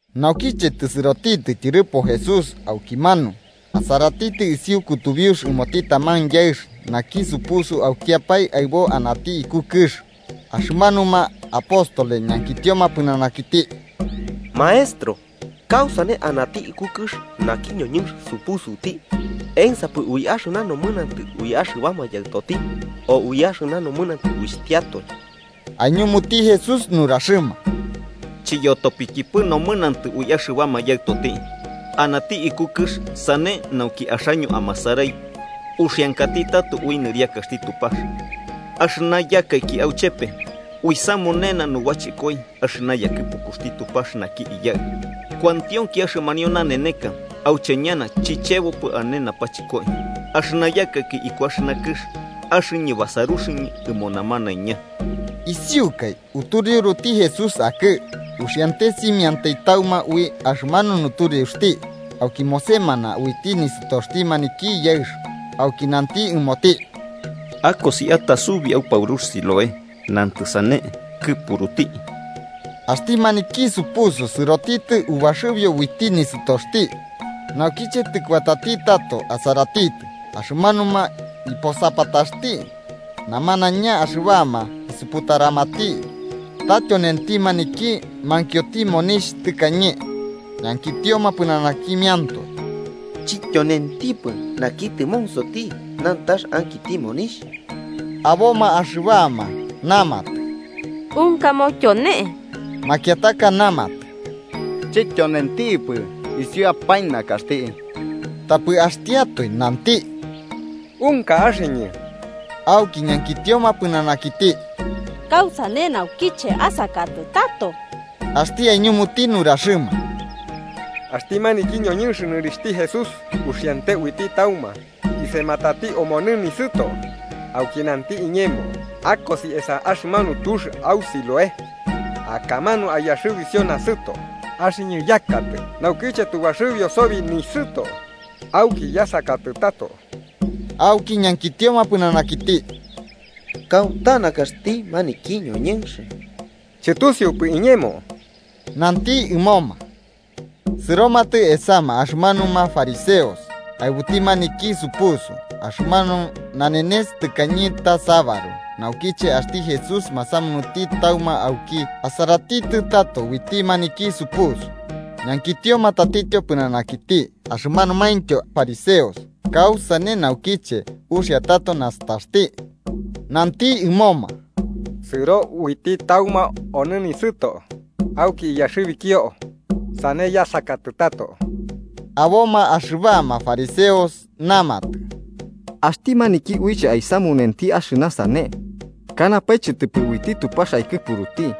Naukiche tɨsɨrotitɨ tyɨrɨpo Jesús aukimanu, asaratitɨ isiu kutubiux ɨmoti taman yaɨx naki supusuti aukiapae aɨbo anati iku kɨx. Axɨmanuma apóstoles ñankitioma pɨnanakiti: –Maestro, ¿kausane anati iku kɨx naki ñoñɨnx supusuti? ¿Ensapɨ ui axɨna nomɨnantɨ ui axɨbama yaɨtoti, o ui axɨna nomɨnantɨ uixhtiatoe? Aiñumuti Jesús nuraxɨma: –Chiyotopikipɨ nomɨnantɨ ui axɨbama yaɨtoti. Anati iku kɨx sane nauki axaño amasarai uxiankati tato ui nɨriakaxti Tupax. Axɨna yakaiki auchepe, uisamunena nubachɨkoi axɨna yakɨpukuxti Tupax naki Iyaɨ. Kuantionki axɨmanio naneneka auche ñana chichebopɨ ane napachɨkoi. Axɨna yakaiki iku axɨna kɨx, axɨñɨ basaruxɨñɨ ɨmo namanaiña. Isiukai utureuruti Jesús akɨ, uxiante simiantai tauma ui axɨmanu nutureuxti, auki mosemana uiti nisɨtoxti maniki yaɨx. Auki nanti ɨmoti: –Akosi atasubi a paurux Siloé (nantɨ sane “Kɨpuruti”). Axti maniki supusu sɨrotitɨ ubaxɨbio uiti nisɨtoxti, naukiche tɨkuatati tato asaratitɨ. Axɨmanuma iposapataxti namanaiña axɨbama isuputaramati ta tyonenti maniki mankioti monixh tɨkañe, ñankitioma pɨnanakimiantoe: –¿Chityonentipɨ naki tɨmonsoti nantax ankiti monixh? Aboma axɨbama namatɨ: –Unkamo tyonenti. Makiataka namatɨ: –Chityonentipɨ, isiuapae nakaxti. Tapɨ axtiatoe nanti: –Unka axɨñɨ. Auki ñankitioma pɨnanakiti: –¿Kausane naukiche asakatɨ tato? Axti aiñumuti nuraxɨma: –Axti maniki ñoñɨnx nɨrixhti Jesús uxiante uiti tauma, isematati omonɨ nisɨto, auki nanti iñemo: ‘Akosi esa axɨmanu tux au Siloé akamanu aiyaxɨbisio nasɨto.’ Axɨñɨ yakatɨ, naukiche tu baxɨbio sobi nisɨto auki yasakatɨ tato. Auki ñankitioma pɨnanakiti. –¿Kauta nakaxti maniki ñoñɨnx? Chɨtusiupɨ iñemo: –Nanti ɨmoma. Sɨromatɨ esama axɨmanuma fariseos aɨbuti maniki supusu. Axɨmanu nanenes tɨkañe ta sabaru naukiche axti Jesús masamunuti tauma auki asaratitɨ tato uiti maniki supusu. Ñankitioma tatityo pɨnanakiti axɨmanumaintyo fariseos kausane naukiche uxia tato nastaxti. Nanti ɨmoma: –Sɨro uiti tauma au nisɨto, auki iyaxɨbikio, sane yasakatɨ tato. Aboma axɨbama fariseos namatɨ: –Axti maniki uiche aisamunenti axɨna sane, kanapae chɨtɨpɨ uiti Tupax aikɨpuruti,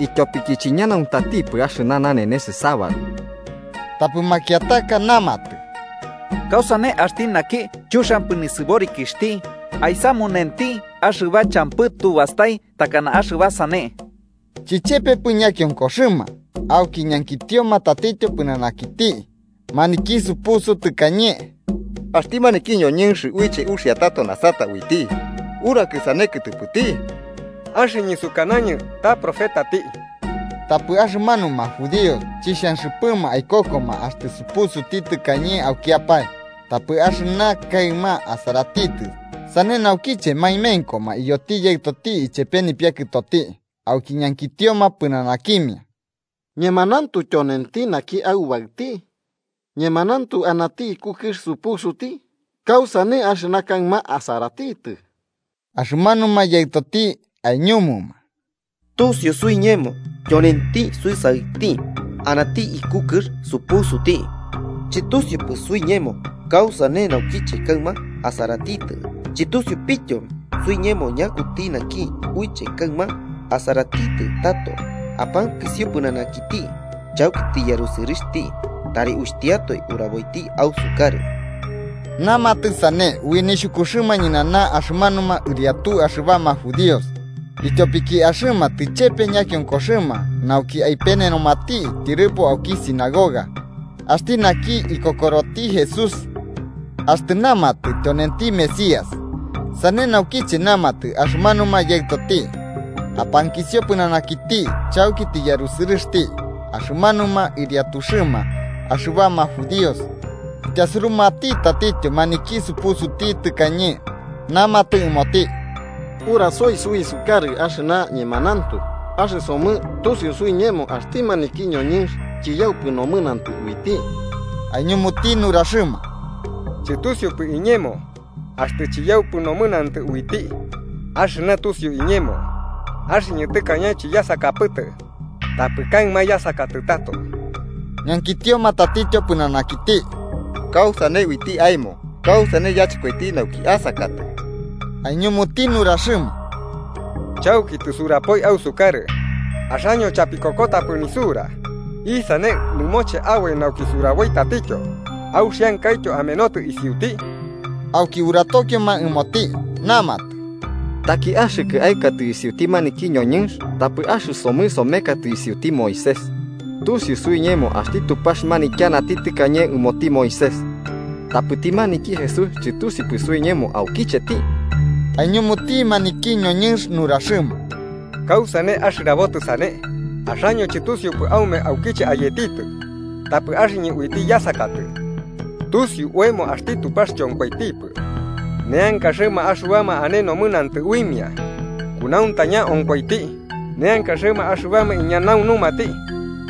ityopiki chiñanauntatipɨ axɨna nanenes sabaru. Tapɨ makiataka namatɨ: –¿Kausane axti naki chuxiampɨ nisɨborikixhti aisamunenti axɨba champɨ tu bastai takana axɨba sane? Chichepepɨ ñakionkoxɨma. Auki ñankitioma tatityo pɨnanakiti maniki supusu tɨkañe: –Axti maniki ñoñɨnx uxia tato nasata uiti, ¿urakɨ sane kɨtɨpɨti? –Axɨñɨ sukanañɨ ta profetati. Tapɨ axɨmanuma judíos chixhanxɨpɨma aikokoma axtɨ supusuti tɨkañe aukiapae, tapɨ axɨna kaɨma asaratitɨ, sane naukiche maemenkoma iyoti yaɨtoti ichepe nipiakɨtoti auki ñankitioma pɨnanakimia: –¿Ñemanauntu tyonenti naki aubaɨti? ¿Ñemanauntu anati iku kɨx supusuti? ¿Kausane axɨna kaɨma asaratitɨ? Axɨmanuma yaɨtoti aiñumuma: –Tusio suiñemo tyonenti suisaɨti, anati iku kɨx supusuti. Chɨtusiupɨ suiñemo kausane naukiche kaɨma asaratitɨ, chɨtusiupityo suiñemo ñakuti naki uiche kaɨma asaratitɨ tato. Apankisio pɨnanakiti. Chauki tɨyarusɨrɨxti, tari uixhtiatoe uraboiti ausukarɨ. Namatɨ sane ui nixhukuxɨma ñɨnana axɨmanuma ɨriatu axɨbama judíos, ityopiki axɨma tɨchepe ñakionkoxɨma nauki aipenenomati tyɨrɨpo auki sinagoga axti naki ikokoroti Jesús axtɨ namati tyonenti Mesías. Sane naukiche namatɨ axɨmanuma yaɨtoti “Apankisio pɨnanakiti, chauki tɨyarusɨrɨxti”. Axɨmanuma ɨriatuxɨma axɨbama judíos ityasurumati tatityo maniki supusuti tɨkañe, namatɨ ɨmoti: –Urasoi suisukarɨ axɨna ñemanauntu. Axɨsomɨ tusiu suiñemo axti maniki ñoñɨnx chiyaupɨ nomɨnantɨ uiti. Aiñumuti nuraxɨma: –Chɨtusiupɨ iñemo axtɨ chiyaupɨ nomɨnantɨ uiti, axɨna tusiu iñemo, axɨñɨ tɨkañe chiyasakapɨtɨ, tapɨ kaɨma yasakatɨ tato. Ñankitioma tatityo pɨnanakiti: –¿Kausane uiti aemo? ¿Kausane yachɨkoiti nauki asakatɨ? Aiñumuti nuraxɨma: –Chauki tɨsurapoi ausukarɨ, axaño chapikokotapɨ nisura. ¿Isane nɨmoche aboi nauki suraboi tatityo? ¿Auxiankaityo amenotɨ isiuti? Auki uratokioma ɨmoti, namatɨ: –Taki axɨkɨ aɨkatɨ isiuti maniki ñoñɨnx. Tapɨ axɨsomɨ somekatɨ isiuti Moisés. Tusiu suiñemo axti Tupax manityanati tɨkañe ɨmoti Moisés, tapɨti maniki Jesús chɨtusiupɨ suiñemo aukicheti. Aiñumuti maniki ñoñɨnx nuraxɨma: –¡Kausane axɨrabotɨ sane! Axaño chɨtusiupɨ aume aukiche ayetitɨ, tapɨ axɨñɨ uiti yasakatɨ. Tusiu oemo axti Tupax chonkoitipɨ neankaxɨma axɨbama ane nomɨnantɨ uimia, kunauntaña onkoiti neankaxɨma axɨbama iñanaunumati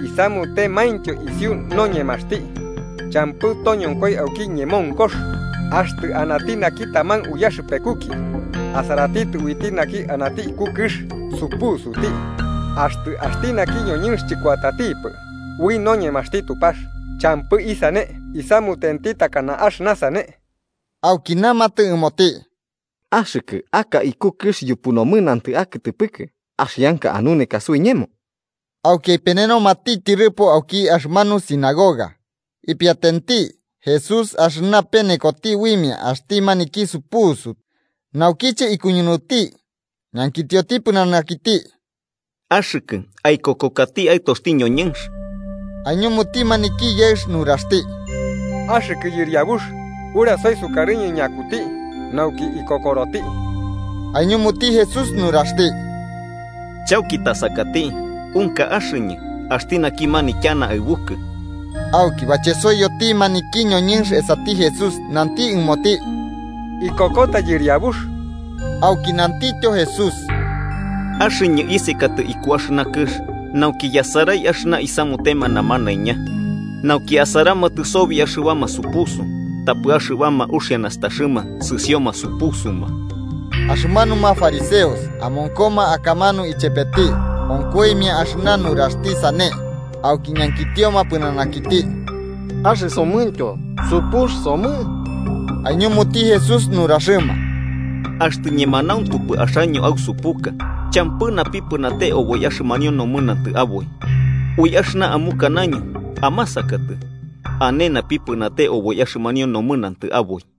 isamutemaintyo isiu noñemaxti. Champɨ toñonkoi auki ñemonkox axtɨ anati naki taman uyaxɨpekuki asaratitɨ uiti naki anati iku kɨx supusuti. Axtɨ axti naki ñoñɨnx chɨkuatatipɨ ui noñemaxti Tupax, champɨ isane isamutenti takana axɨna sane. Auki namatɨ ɨmoti: –Axɨkɨ, aka iku kɨx yupu nomɨnantɨ akɨtɨpɨkɨ, ¿axianka anuneka suiñemo? Auki aipenenomati tyɨrɨpo auki axɨmanu sinagoga. Ipiatenti Jesús axɨna penekoti uimia axti manki supusu. Naukiche ikuñunuti ñankitioti pɨnanakiti: –¿Axɨkɨ aikokokati Aɨtoxti ñoñɨnx? Aiñumuti maniki yaɨx nuraxti: –Axɨ Yɨriabux, urasoi sukarɨñɨ ñakuti, nauki ikokoroti. Aiñumuti Jesús nuraxti: –Chauki tasakati: unka axɨñɨ, axti naki manityana aɨbukɨ. Auki bachesoiyoti maniki ñoñɨnx esati Jesús, nanti ɨmoti: –Ikokota, Yɨriabux. Auki nantityo Jesús: –Axɨñɨ isekatɨ iku axɨna kɨx nauki yasarai axɨna isamutema namanaiña. Nauki asaramatɨ sobi axɨbama supusu tapɨ axɨbama uxia nastaxɨma sɨsioma supusuma. Axɨmanuma fariseos amonkoma akamanu ichepeti, onkoimia axɨna nuraxti sane, auki ñankitioma pɨnanakiti: –¿Axɨsomɨntyo supux somɨ? Aiñumuti Jesús nuraxɨma: –Axtɨ ñemanauntupɨ axaño ausupuka, champɨ napipɨnate oboi axɨmanio nomɨnantɨ aboi. Ui axɨna amukanaño amasakatɨ, ane napipɨnate oboi axɨmanio nomɨnantɨ aboi.